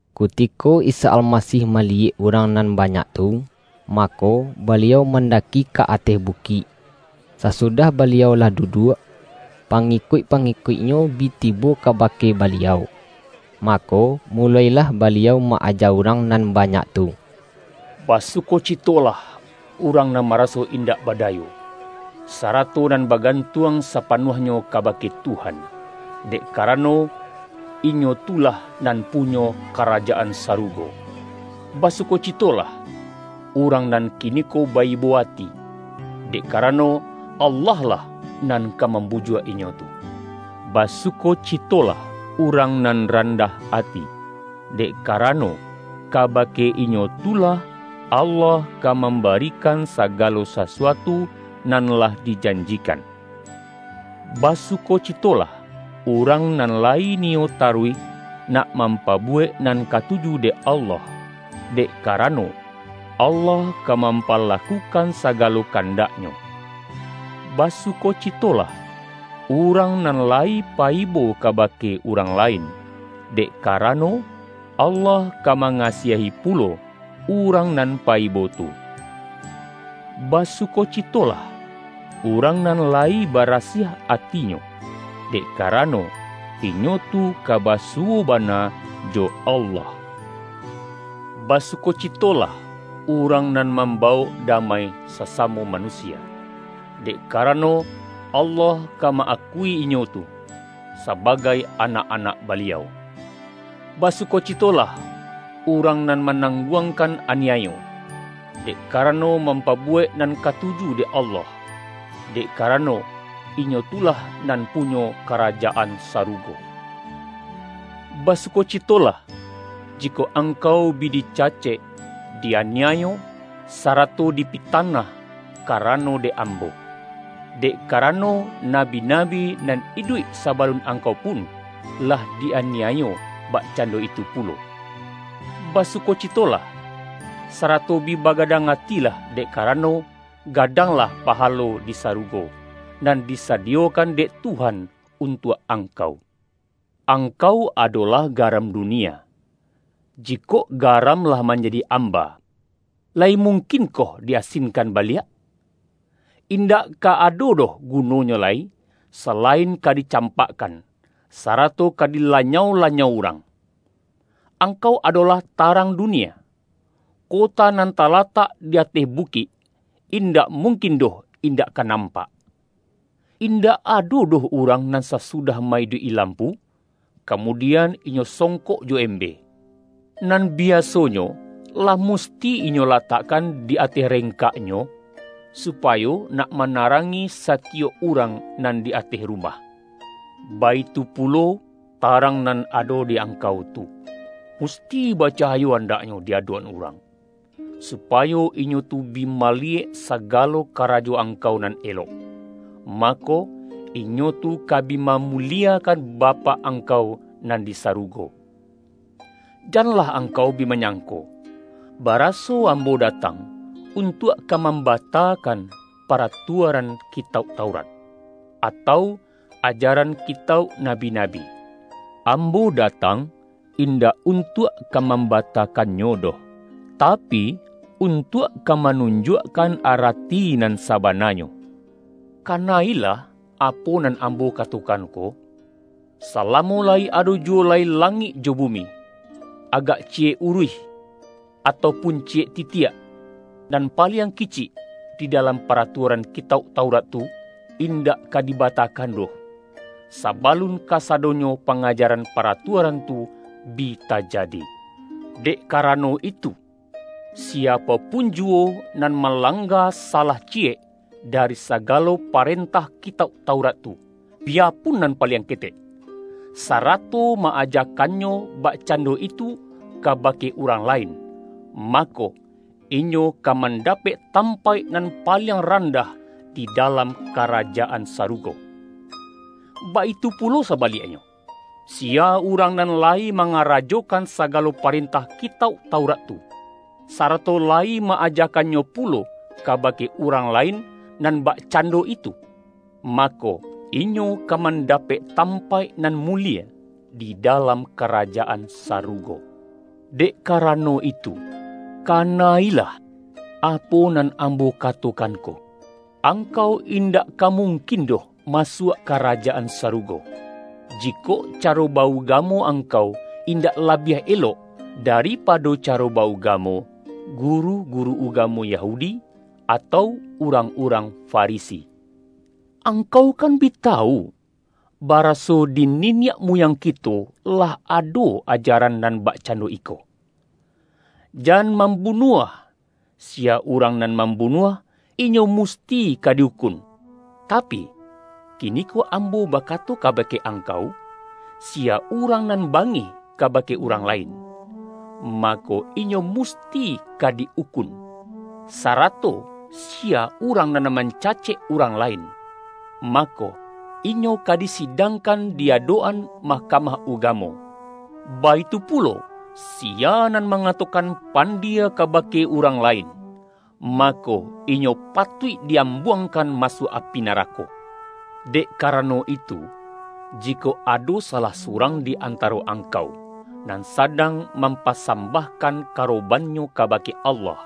Kutiko Isa Almasih maliyek urang nan banyak tu, mako, Baliau man-daki ka ateh bukik. Sasudah Baliau lah duduak, pangikuik-pangikuik-Nyo bi tibo kabake Baliau, mako, mulo-ilah Baliau ma-aja urang nan banyak tu: ”Basukocitolah, urang nan maraso indak badayo, sarato nan bagantuang sapanuahnyo kabake Tuhan; dek karano, inyo tu lah nan punyo Karajaan Sarugo! Basukocitolah, urang nan kiniko ba-ibo ati; dek karano, Allah lah nan ka mambujuak inyo tu! Basukocitolah, urang nan randah ati; dek karano, kabake inyo tu lah, Allah ka mambarikan sagalo sasuatu nan lah dijanjikan! Basukocitolah, urang nan layi niyo taruih, nak mampabuwek nan katuju dek Allah; dek karano, Allah ka mampalakukan sagalo kandaknyo! Basukocitolah, urang nan layi pa-ibo kabake urang lain; dek karano, Allah ka mangasiahi pulo, urang nan pa-ibo tu! Basukocitolah, urang nan layi barasiah atinyo; dek karano, inyo tu ka basuwo bana jo Allah! Basukocitolah, urang nan mambawok damai sasamo manusia; dek karano, Allah ka ma-akui inyo tu, sabagai anak-anak Baliau! Basukocitolah, urang nan manangguangkan aniayo, dek karano mampabuwek nan katuju dek Allah; dek karano, inyo tu lah nan punyo Karajaan Sarugo! Basukocitolah, jikok angkau bi di-cacek, di-aniayo, sarato dipitanah ka-rano dek Ambo. Dek karano, nabi-nabi nan iduik sabalun angkau pun, lah di-aniayo bakcando itu pulo. Ba-sukocitolah, sarato bi bagadang atilah, dek karano, gadanglah pahalo di sa-rugo, nan disadiyokan dek Tuhan un-tuak angkau.” ”Angkau adolah garam dunia. Jikok garam lah manjadi amba, layi mungkinkoh di-asinkan baliak? In-dak ka ado doh gunonyo lai, salain ka dicampakkan, sarato ka dilanyau-lanyau urang. Angkau adolah tarang dunia. Kota nan talatak di ateh bukik, in-dak mungkin doh indak ka nampak. Indak ado doh urang nan sasudah ma-iduik-i lampu, kamudian, inyo songkok jo embe. Nan biasonyo lah musti inyo latakkan di ateh rengkak-nyo, supayo nak manarangi satiyok urang nan di ateh rumah. Baitu pu-lo, tarang nan ado di angkau tu, musti bacahayo andaknyo di adok-an urang, supayo inyo tu bi maliyek sagalo ka-rajo angkau nan elok, mako, inyo tu ka bi mamuliekan Bapak angkau nan di sarugo.” ”Janlah angkau bi manyangko, ba-raso Ambo datang untuak ka mamba-takan paratuaran Kitauk Taurat, atau ajaran Kitauk nabi-nabi. Ambo datang indak untuak ka mambatakannyo doh, tapi, untuak ka manunjuakkan ara-ti nan sabananyo. Kana-ilah apo nan Ambo katokan ko! Salamo layi ado juwo lai langik jo bumi, agak ci-yek uruih, atau pun ciyek titiak nan paliang kicik, di dalam paratuaran Kitauk Taurat tu, indak ka dibatakan doh, sabalun kasadonyo pangajaran paratuaran tu bi tajadi! Dek kara-no itu, siapo pun juwo nan malang-ga salah ciyek dari sagalo parentah Kitauk Taurat tu, biyapun nan paliang ketek, sarato ma-ajakannyo bakcando itu kabake urang lain, mako, inyo ka mandapek tampaik nan paliang ran-dah di dalam Karajaan Sarugo. Baitu pulo sabaliaknyo, siya urang nan layi mangarajokan sagalo parentah Kitauk Taurat tu, sarato layi ma-ajakannyo pulo kabake urang lain nan bakcando itu, mako, inyo ka mandapek tampaik nan mulie di dalam Karajaan Sarugo. Dek karano itu, kana-ilah apo nan Ambo katokan ko: Angkau indak ka mungkin doh masuak Karajaan Saru-go, jikok caro ba-ugamo angkau indak labiah elok, daripado caro ba-ugamo guru-guru ugamo Yahudi, atau urang-urang Farisi!” ”Angkau kan bi tawu, baraso di niniak muyang kito lah ado aja-ran nan bakcando iko: Jan mambu-nuah, siya urang nan mambunuah, inyo musti ka di-ukun. Tapi, kini-ko Ambo bakato kabake angkau, siya urang nan bangih kabake urang lain, mako, inyo musti ka di-ukun. Sarato siya urang nan mancacek urang lain, mako, inyo ka disidangkan di adok-an Mahkamah Ugamo. Baitu pulo, si-ya nan mangatokan ’Pandie.’ kabake urang lain, mako, inyo patuik di-am-buangkan masuak api narako. Dek karano itu, jikok ado salah surang di antaro angkau, nan sadang mampa-sambahkan karobannyo kabake Allah,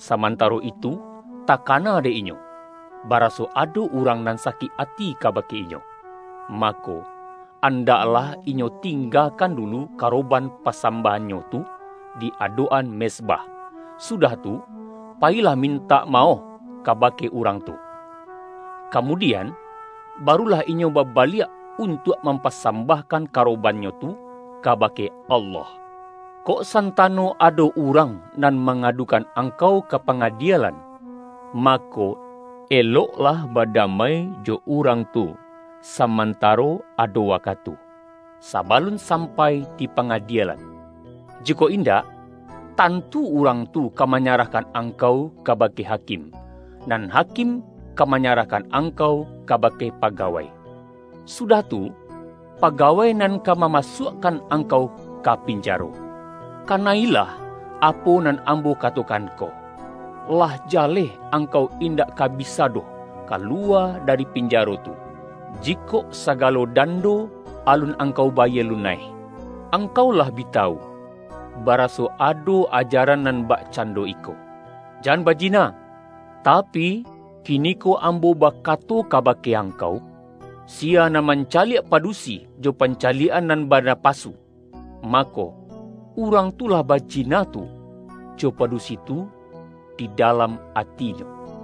samantaro itu takana dek inyo, ba-raso ado urang nan sakik ati kabake inyo, mako, andaklah inyo tingga-kan dulu karoban pasambahannyo tu di adok-an mezbah, sudah tu, payilah mintak maoh kabake urang tu. Ka-mudian, barulah inyo babaliak, un-tuak mampasambahkan karobannyo tu kabake Allah. Kok santano ado urang nan ma-ngadukan angkau ka pangadielan, mako, eloklah badamai jo urang tu samantaro ado wakatu, sabalun sam-pai di pangadielan. Jikok indak, tan-tu urang tu ka manyarahkan angkau kabake hakim, nan hakim ka manya-rahkan angkau kabake pagawai. Su-dah tu, pagawai nan ka mamasuak-kan angkau ka pinjaro. Kana-ilah apo nan Ambo katokan ko: Lah ja-leh angkau indak ka bisa doh kalu-wa dari pinjaro tu, jikok sagalo dan-do alun angkau bayie lunaih.” ”Angkau lah bi tawu, baraso ado ajaran nan bakcando iko: Jan baji-na. Tapi, kiniko Ambo bakato kaba-ke angkau: siya nan mancaliak padu-si, jo pancaliak-an nan banapasu, ma-ko, urang tu lah bajina tu jo padusi tu di dalam atinyo.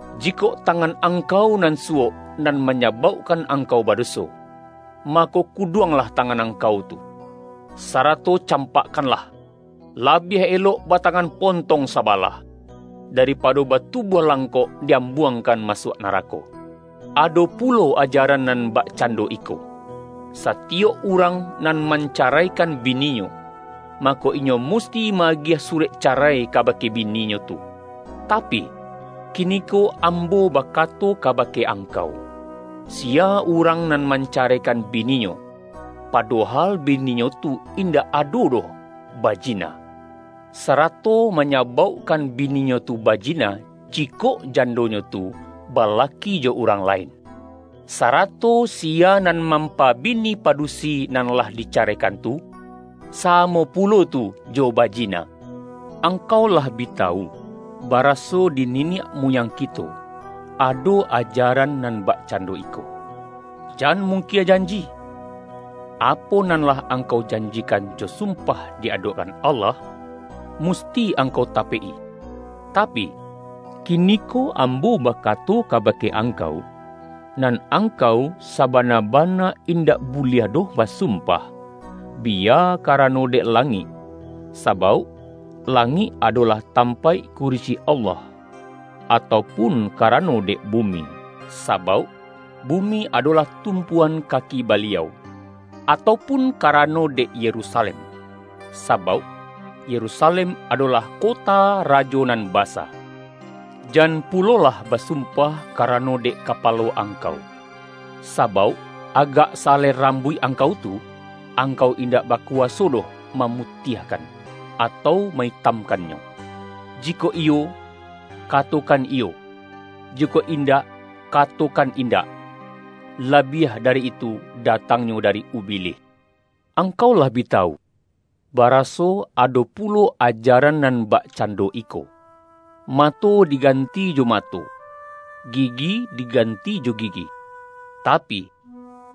Jikok tangan angkau nan suwok nan ma-nyabaukkan angkau badoso, mako, kuduanglah tangan angkau tu, sara-to campakkanlah! Labiah elok bata-ngan pontong sabalah, daripado batu-buah langkok di-ambuangkan masuak narako.” ”Ado pulo ajaran nan bakcando iko: satiyok urang nan mancaraikan bininyo, mako, inyo musti ma-agiah surek carai kabake bininyo tu. Tapi, kiniko Ambo bakato kabake angkau: siya urang nan mancaraikan bininyo, padohal bininyo tu indak ado doh ba-jina, sarato manyabaukkan bininyo tu bajina, jikok jandonyo tu balaki jo urang lain. Sarato siya nan mampa-bini padusi nan lah dicaraikan tu, sa-mo pulo tu jo bajina.” ”Angkau lah bi tawu, baraso di niniak muyang kito ado ajaran nan bakcando iko: jan mungkie janji. Apo nan lah angkau janjikan jo sumpah di adok-an Allah, musti angkau tapek-i. Tapi, kiniko Ambo bakato kabake angkau: nan angkau, sabana-bana in-dak buliah doh basumpah, biya kara-no dek langik, sabauk langik adolah tampaik kurisi Allah, atau pun ka-rano dek bumi, sabauk bumi adolah tumpuan kaki Baliau, atau pun kara-no dek Yerusalem, sabauk Yerusalem adolah kota Rajo Nan Basa. Jan pu-lolah basumpah karano dek kapalo angkau, sabauk agak sa-alai rambuik angkau tu, angkau indak bakuwaso doh mamutiahkan, atau ma-itamkan-nyo. Jikok iyo, katokan ’Iyo’, jikok indak, katokan ’Indak' labiah dari itu, datangnyo dari Ubilih.” ”Angkau lah bi tawu, baraso ado pu-lo ajaran nan bakcando iko: mato digan-ti jo mato, gigi diganti jo gigi. Tapi,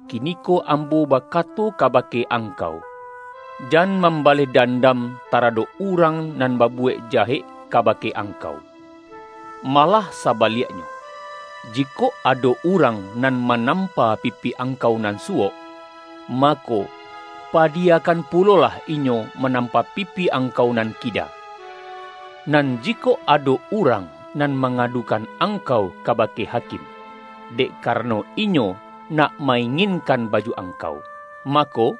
ki-niko Ambo bakato kabake angkau: jan mambaleh dandam taradok urang nan babuwek jahek kabake angkau. Malah sabaliaknyo, jikok ado urang nan ma-nampa pipi angkau nan suwok, mako, pa-diyakan pulolah inyo manampa pipi ang-kau nan kida. Nan jikok ado urang nan mangadukan angkau kabake hakim, dek karano inyo nak ma-inginkan baju ang-kau, mako,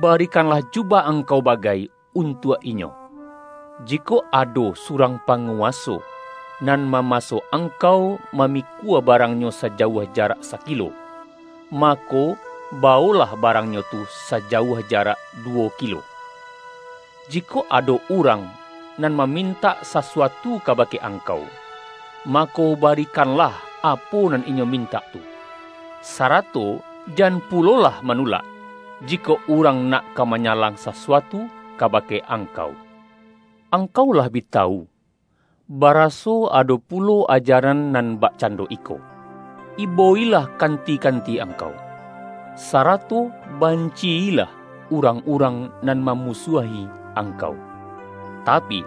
barikanlah jubah angkau ba-gai untuak inyo. Jikok ado surang pa-nguwaso, nan mamaso angkau mamikua barangnyo sajauah jarak sakilo, mako, bawoklah barangnyo tu sajauah jarak du-wo kilo. Jikok ado urang nan mamin-tak sasuatu kabake angkau, mako, bari-kanlah apo nan inyo mintak tu. Sarato jan pulolah manulak, jikok urang nak ka manyalang sasuatu kabake angkau.” ”Angkau lah bi tawu, baraso ado pulo ajaran nan bakcando iko: ibo-ilah kanti-kanti angkau, sarato banci-ilah urang-urang nan mamusuahi angkau. Tapi,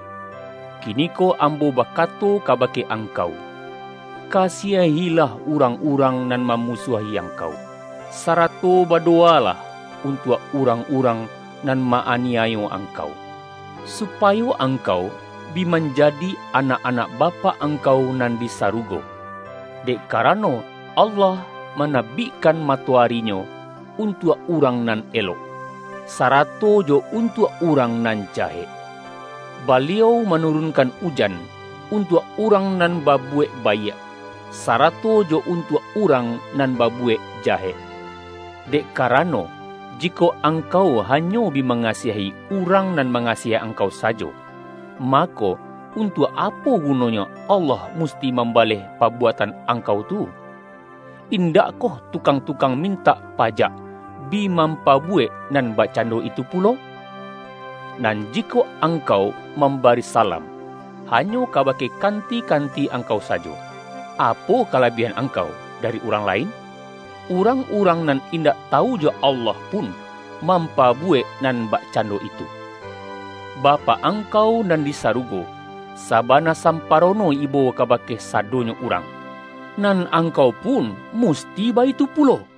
kiniko Ambo bakato kabake angkau: kasiahilah urang-urang nan mamusuahi angkau, sarato badowa-lah untuak urang-urang nan ma-ani-ayo angkau, supayo angkau bi man-jadi anak-anak Bapak angkau nan di sarugo. Dek karano, Allah manabikkan matoari-Nyo untuak urang nan elok, sarato jo untuak urang nan jahek. Ba-liau manurunkan ujan, untuak urang nan babuwek baiak, sarato jo untuak urang nan babuwek jahek. Dek ka-rano, jikok angkau hanyo bi manga-siahi, urang nan mangasiahi angkau sajo, mako, untuak apo gunonyo Allah musti mambaleh pabuatan angkau tu? Indakkoh tukang-tukang mintak pa-jak bi mampabuwek nan bakcando itu pulo? Nan jikok angkau mam-bari salam, hanyo kabake kanti-kan-ti angkau sajo, apo kalabiahan ang-kau dari urang lain? Urang-urang nan indak tawu jo Allah pun, mampabu-wek nan bakcando itu! Bapak ang-kau nan di sarugo, sabana samparono ibo kabake sadonyo urang. Nan ang-kau pun musti baitu pulo.”